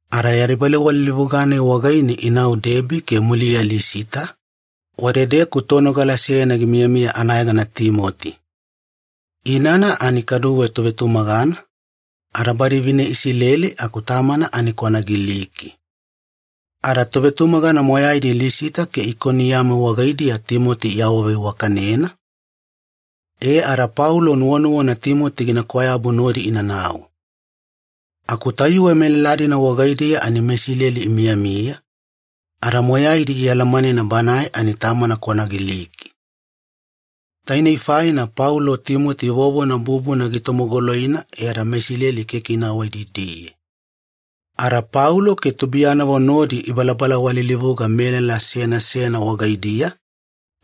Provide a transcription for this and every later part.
Ada yadi balawalilivuga-nai wagaine inau Debi ke muliya Lisita, wadedeku tonogala seyana gimiyamiya anayegana Timoti. Inana ani kaduwe tovetumagana, ada badi vine Isileli aku tamana ani kwana Giliki. Ada tovetumagana moyaidi Lisita ke Ikoniyamu wagaidiya Timoti iawaveiwakanena, e ada Paulo nuwanuwana Timoti gina kwayabu nodi inanau. Aku tayuwe melala-dina wagaidiya ani meIsileli imiyamiya, ada moyaidi ialamanena banae ani tamana kwana Giliki. Tainei faina Paulo Timoti vovona bubuna gitomogoloina e ada meIsileli keke ina awaididiye. Ada Paulo ke tubuiyanavo nodi ibalabala walilivuga melala seyana seyana wagaidiya,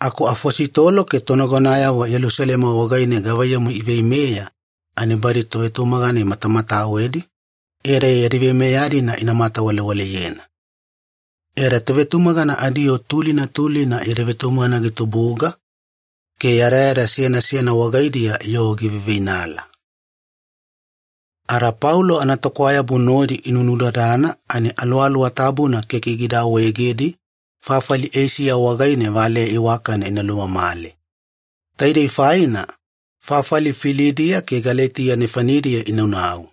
aku afositolo ke tonagonayavo Yelusalema wagaine gavaiyamu iveimeya ani badi tovetumagana imatamatawedi, e ada yadi veimeya-dina ina matamatawalewaleyena. E ada tovetumagana adiyoo tulina tulina yadi vetumagana gitubuga, ke yadayada seyana seyana wagaidiya yoo giveiveinala. Ada Paulo anatokwayabu nodi inunudadana ani Aluwaluwa Tabuna keke gida awaegedi fafali Eisiya wagaine valeya iwakana ina lumamale. Taidei faina, fafali Filidiya ke Galetiya nefanidiya inaunau.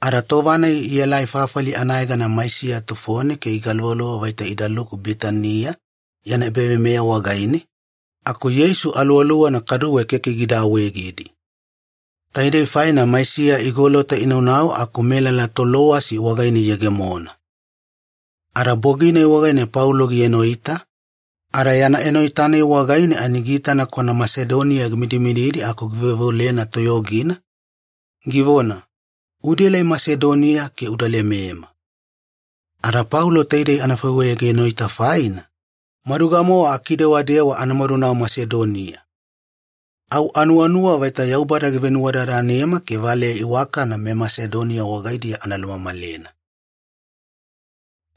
Ada tova-nai ielai fafali anayegana Maisiya tufone ke igaluvaluva vaita idaluku Bitaniya yana ebaveimeya wagaine, aku Yeisu Aluwaluwana kaduwe keke gida awaegedi. Taidei faina Maisiya igolota inaunau aku melala Tolowasi wagaine iyegemona. Ada bogi-nai wagaine Paulo gienoita, ada yana enoita-nai wagaine ani giitana kwana Masedonia gimidimididi aku giveoveolena toyogina, givona, “Udaelai Masedonia ke uda lemema.” Ada Paulo taidei anafaiweya gienoita faina, maduga-mowa akidewadewa ana madunau Masedonia. Au anuwanuwa vaita Yaubada givenuwadadanema ke valeya iwakana meMasedonia wagaidiya ana lumamalena.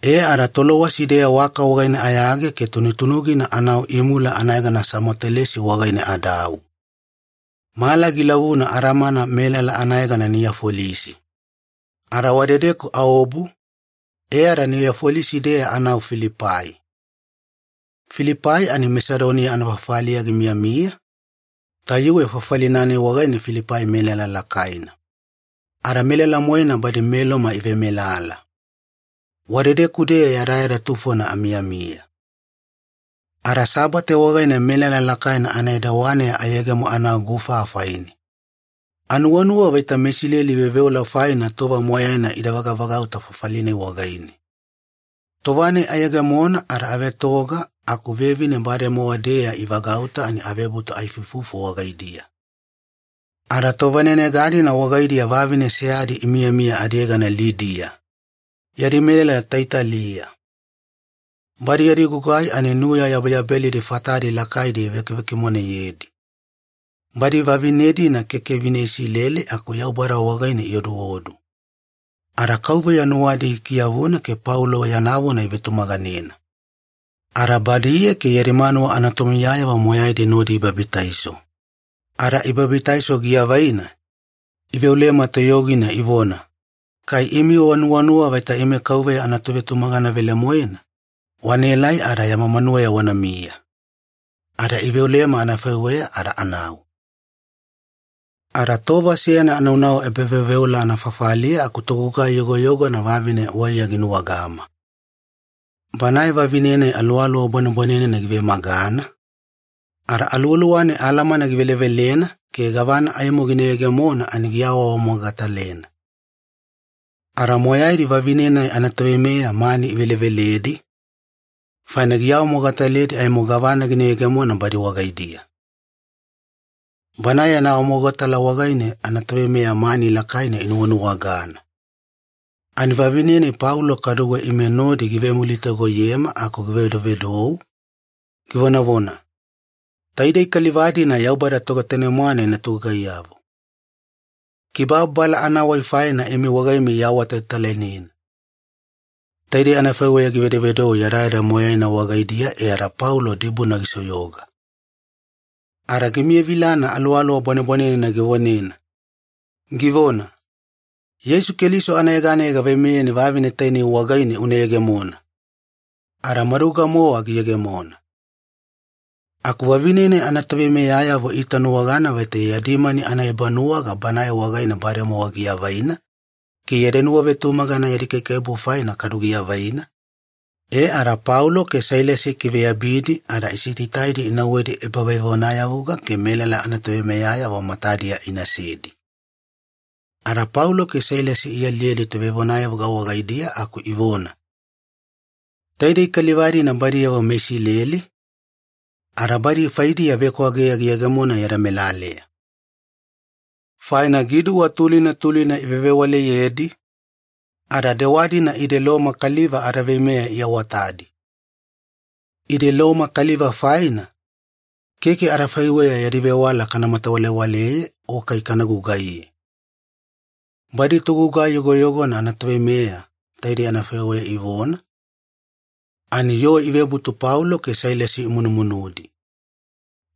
E ada Tolowasi-deya waka wagaine ayage ke tunutunugina anau imula anayegana Samotelesi wagaine adau. Mala gilavuna adamana melala anayegana Niyafolisi. Ada wadedeku aobu, e ada Niyafolisi-deya anau Filipai. Filipai ani Masedonia anafafaliya gimiyamiya, tayuwe fafali-nai wagaine Filipai melala lakaina. Ada melala-moena badi meLoma ivemelala. Wadedeku-deya yadayada tufona amiyamiya. Ada Sabate wagaine melala lakaina anaedawaneya ayegemo anau gufa afaine. Anuwanuwa vaita meIsileli veoveola faina tova moyaina ida vagavagauta fafali-nai wagaine. Tova-nai ayegemona ada avetoga aku vevine bademowa-deya ivagauta ani avebutu aifuifufu wagaidiya. Ada tovanenega-dina wagaidiya vavine seyadi imiyamiya adiyegana Lidia, yadi melala Taiyatila. Badi yadi gugai ani nuya yabeyabelidi fatadi lakaina ivekivekimoneyedi. Badi vavine-dina keke vine Isileli aku Yaubada wagaine ioduodu. Ada KAUVEYA nuwadi gikiyavuna ke Paulo yana vona ivetumaganena. Ada badiye ke yadi manuwa anatomiyayavo moyaidi nodi ibabitaiso. Ada ibabitaiso giavaina, iveolema toyogina ivona, “Kai imi wanuwanuwa vaita ime Kauveya anatovetumagana velemoena, wanaelai ada yama manuweya wanamiya.” Ada iveolema anafaiweya ada anau. Ada tova seyana anaunau ebaveoveola anafafaliya aku togugai yogoyogona vavine waiya ginuwagama. Banae vavine-nai aluwaluwa bwanebwanenena givemagana, ada aluwaluwa-nai alamana givelevelena ke gavana aimo gina yegemona ani giawaawamogatalena. Ada moyaidi vavine-nai anatoveimeya mani iveleveledi, faina gina awamogataledi aimo gavana gina yegemona badi wagaidiya. Banae yana awamogatala wagaine anatoveimeya mani lakaina inuwanuwagana. Ani vavine-nai Paulo kaduwe ime nodi givevemulitagoyema aku givedovedou, givonavona, “Taidei kaliva-dina Yaubada Togetanemwane yana togugaiyavo. Kibababala anawai faina imi wagaimiya iawatalatalainena.” Taidei anafaiweya givedovedou yadayada moyaina wagaidiya e ada Paulo dibuna gisoyoga. Ada gimiyavilana aluwaluwa bwanebwanenena givonena, givona, “Yeisu Keliso anayeganeya gaveimeyeni vavine tainei wagaine una yegemona!” Ada maduga-mowa giyegemona. Aku vavine-nai anatoveimeyayavo iitanuwagana vaita yadi mani anaebanuwaga banae wagaine bademowa giavaina ke yadi nuwavetumagana yadi kaikaiwabu faina kadu giavaina, e ada Paulo ke Sailasi ikiveyabidi ada isitaitaidi inauwedi ebavevonayavuga ke melala anatoveimeyayavo matadiya inasedi. Ada Paulo ke Sailasi ialiyedi tovevonayavuga wagaidiya aku ivona, “Taidei kaliva-dina badiyavo meIsileli, ada badi faidiya vekwageya giyegemona yada melaleya. Faina giduwa tulina tulina ivevewaleyedi, ada dewa-dina ide Loma kaliva adaveimeya iawatadi. Ide Loma kaliva faina, keke adafaiweya yadi vewala kana matawalewaleye o kai kana gugaiye.” Badi togugai yogoyogona anatoveimeya taidei anafaiweya ivona, ani yoo ivebutu Paulo ke Sailasi imunumunudi.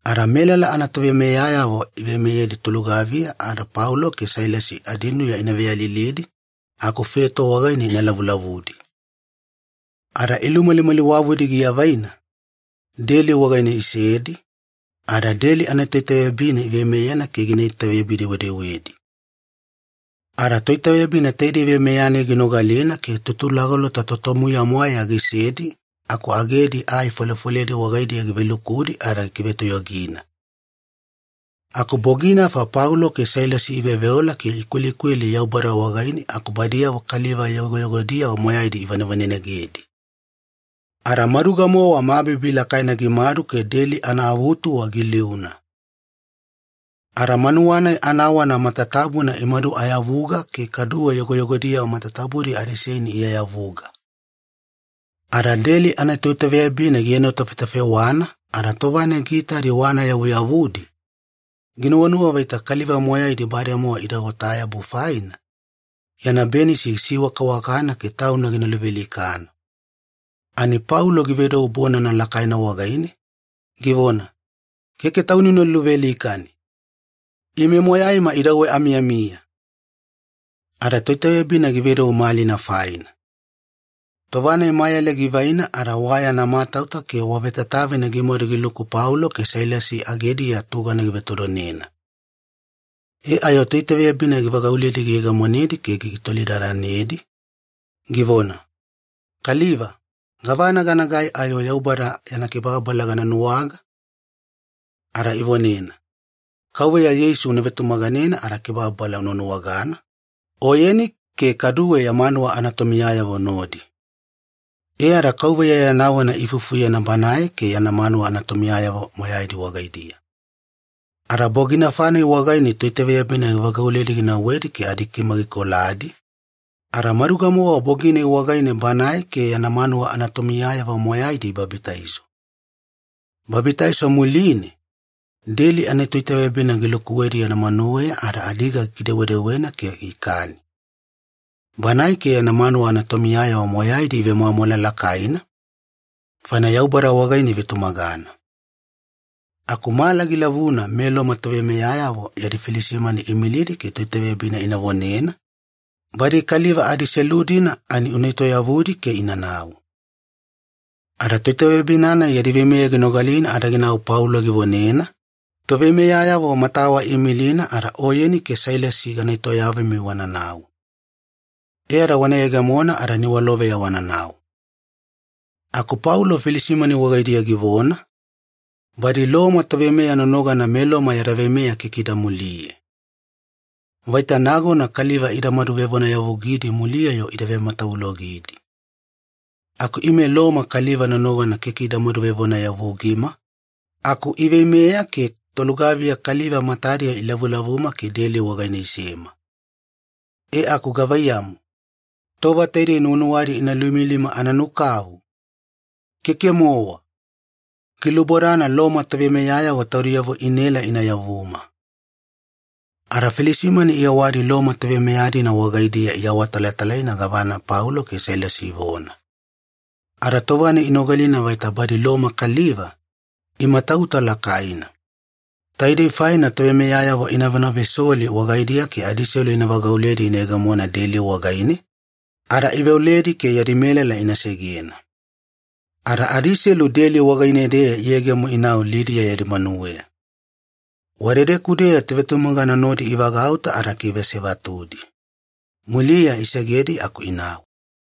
Ada melala anatoveimeyayavo iveimeyedi tolugaviya ada Paulo ke Sailasi adinuya ina veyalilidi aku feto wagaine ina lavulavudi. Ada ilumalimaliwavudi giavaina, deli wagaine isedi, ada deli anatoitaveyabina iveimeyena ke gina itaveyabi-dewedewedi. Ada toitaveyabina taidei veimeya-nai ginogalina ke tutulagolota totomuya-mwaeya gisedi aku agedi ai folefoledi wagaidiya givelukudi ada gikivetoyogina. Aku boginafa Paulo ke Sailasi iveoveola ke ikwelikweli Yaubada wagaine aku badiyavo kaliva yogoyogodiyavo moyaidi ivanevanenegedi. Ada maduga-mowa mabibi lakaina gimadu ke deli anaavutuwa giliuna. Ada manuwa-nai anawana matatabuna imaduayavuga ke kaduwe yogoyogodiyavo matatabudi adiseini iayavuga. Ada deli anatoitaveyabina gienotafetafewana ada tova-nai giitadi wana yavuyavudi, ginuwanuwa vaita kaliva moyaidi bademowa ida otayabu faina, yana benisi gisiwakawakana ke tauna gina luvealikana. Ani Paulo givedou bonana lakaina wagaine, givona, “Keke tauni una luvealikani! Ime moyaima idauwe amiyamiya!” Ada toitaveyabina givedou malina faina. Tova-nai mayale givaina ada wa yana matauta ke wa vetatavina gimadu giluku Paulo ke Sailasi agediya tugana givetodonena. E ayo toitaveyabina givagauledi giyegemonedi ke gitolidadanedi, givona, “Kaliva, gavana ganagai ayo Yaubada yana kibababala gana nuwaga?” Ada ivonena, “Kauveya Yeisu una vetumaganena ada kibababala una nuwagana, oyeni ke kaduwe ya manuwa anatomiyayavo nodi.” E ada Kauveya yana vona iifufuyena banae ke yana manuwa anatomiyayavo moyaidi wagaidiya. Ada boginafa-nai wagaine toitaveyabina givagauledi ginauwedi ke adikima gikoladi, ada maduga-mowa bogi-nai wagaine banae ke yana manuwa anatomiyayavo moyaidi ibabitaiso. Babitaiso muline, deli anatoitaveyabina gilukuwedi yana manuweya ada adiga gikidewadewena ke ikani. Banae ke yana manuwa anatomiyayavo moyaidi ivemwamwala lakaina, faina Yaubada wagaine ivetumagana. Aku mala gilavuna meLoma toveimeyayavo yadi filisimani iimilidi ke toitaveyabina ina vonena, “Badi kaliva-dina adiselu ani una etoyavudi ke inanau.” Ada toitaveyabina-nai yadi veimeya ginogalina ada ginau Paulo givonena, “Toveimeyayavo matawa iimilina ada oyeni ke Sailasi gana etoyavumi wananau. E ada wana yegemona ada niwaloveya wananau.” Aku Paulo filisimani wagaidiya givona, “Badi Loma toveimeya nonogana meLoma yada veimeya keke ida muliye. Vaita nagona kaliva idamadu vevonayavugidi muliya-yo ida vematavulogidi. Aku ime Loma kaliva nonogana keke idamadu vevonayavugima, aku iveimeya ke tolugaviya kaliva matadiya ilavulavuma ke deli wagaine isema. E aku gavaiyamu, tova taidei nuwanuwadi ina luimilima ana nukavu? Keke-mowa! Gilubodana Loma toveimeyayavo taudiyavo inaela ina yavuma.” Ada filisimani iyewadi Loma toveimeya-dina wagaidiya iawatalatalaina gavana Paulo ke Sailasi ivona. Ada tova-nai inogalina vaita badi Loma kaliva, imatauta lakaina. Taidei faina toveimeyayavo ina ivonavesoli wagaidiya ke adiselu ivagauledi iyegemona deli wagaine, ada iveoledi ke yadi melala ina segena. Ada adiselu deli wagaine-deya iyegemo inau Lidia yadi manuweya. Wadedeku-deya tovetumagana nodi ivagauta ada ikiveasevatudi. Muliya isegedi aku inau.